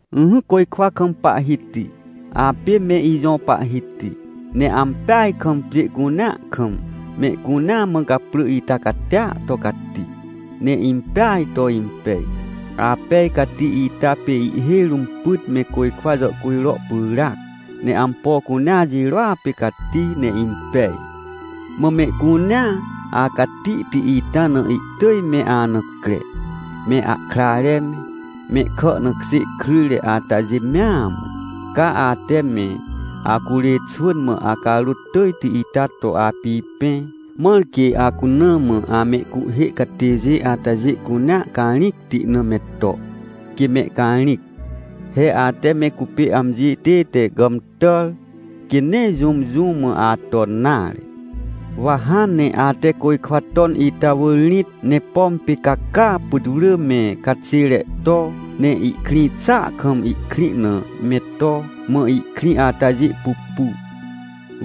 Ỹhỹ côjkwa kam Pahhiti, apê me ijõ Pahhiti. Ne ampeaj kam pjê cunea kam, mehcunea mã gaprỳ ita catia to cati, ne impeaj to impej! Apej cati ita pê ihhêj rũm pyt me côjkwa jàhcujro pyràac, ne ampo cunea jirôa pê cati ne impej. Mã mehcunea acatihti ita na ihtỳj me ana cre, me ahkrare me, mehkà na kjê kryjre atajê mea mã. Ca ate me acurê xwỳn mã acarôt tỳjti ita to apipẽ, mãr quê acuna mã amehcuhhê catêjê atajê cunea carĩcti na me to, quê mehcarĩc. He ate me cupê amji tête gàmtàr, quê nee jũm, jũ mã aton nare. Wa hãn ne ate côjkwa ton ita wỳr rĩt, ne pom pê ca caa putwrỳ me caxêre to, ne ihkrĩ xàa kam ihkrĩ na me to, mã ihkrĩ atajê pupu.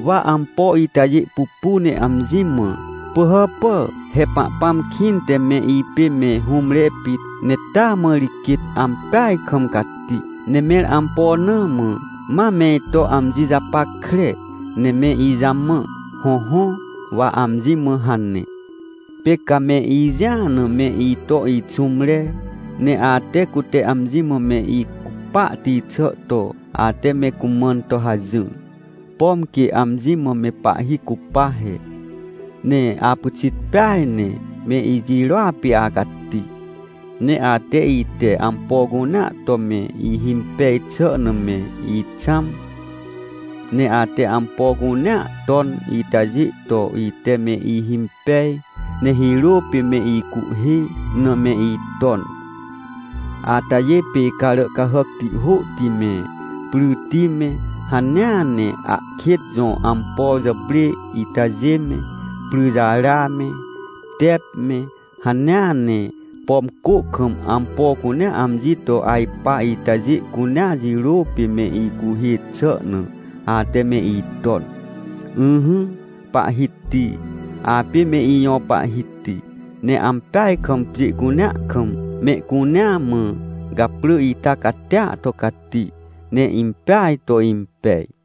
Wa ampo itajê pupu ne amji mã: “Pỳhàpà, he Pahpãm kĩnte me ipê me hũmre pit, ne taa mã ri quêt ampeaj kam cati. Ne mẽr ampo na mã, ma me ito amji japackre ne me ijamã?” Hõhõ, wa amji mã hane. Pê ca me ijĩa na me ito ixũmre. Ne ate, cute amji mã me icupahti xà to ate me cumãn to hajỹr, pom quê amji mã me pahhi cupa he. Ne apyxit peaj ne me ijirôa pê acati. Ne ate, ite ampo cunea to me ihimpej xà na me ixãm. Ne ate ampo cunea ton itajê to ite me ihimpej, ne hirô pê me icuhhê na me iton. Atajê pê carà cahàcti hôhti me, pryti me, hanea ne ahkêt jõ ampo jàprê itajê me, pryrejara me, tep me, hanea ne, pom cô kam ampo cunea amji to ajpa itajê cunea jirô pê me icuhhê xà na, ate me iton. Ỹhỹ Pahhiti, apê me ijõ Pahhiti! Ne ampeaj kam pjê cunea kam mehcunea mã gaprỳ ita catia to cati, ne impeaj to impej.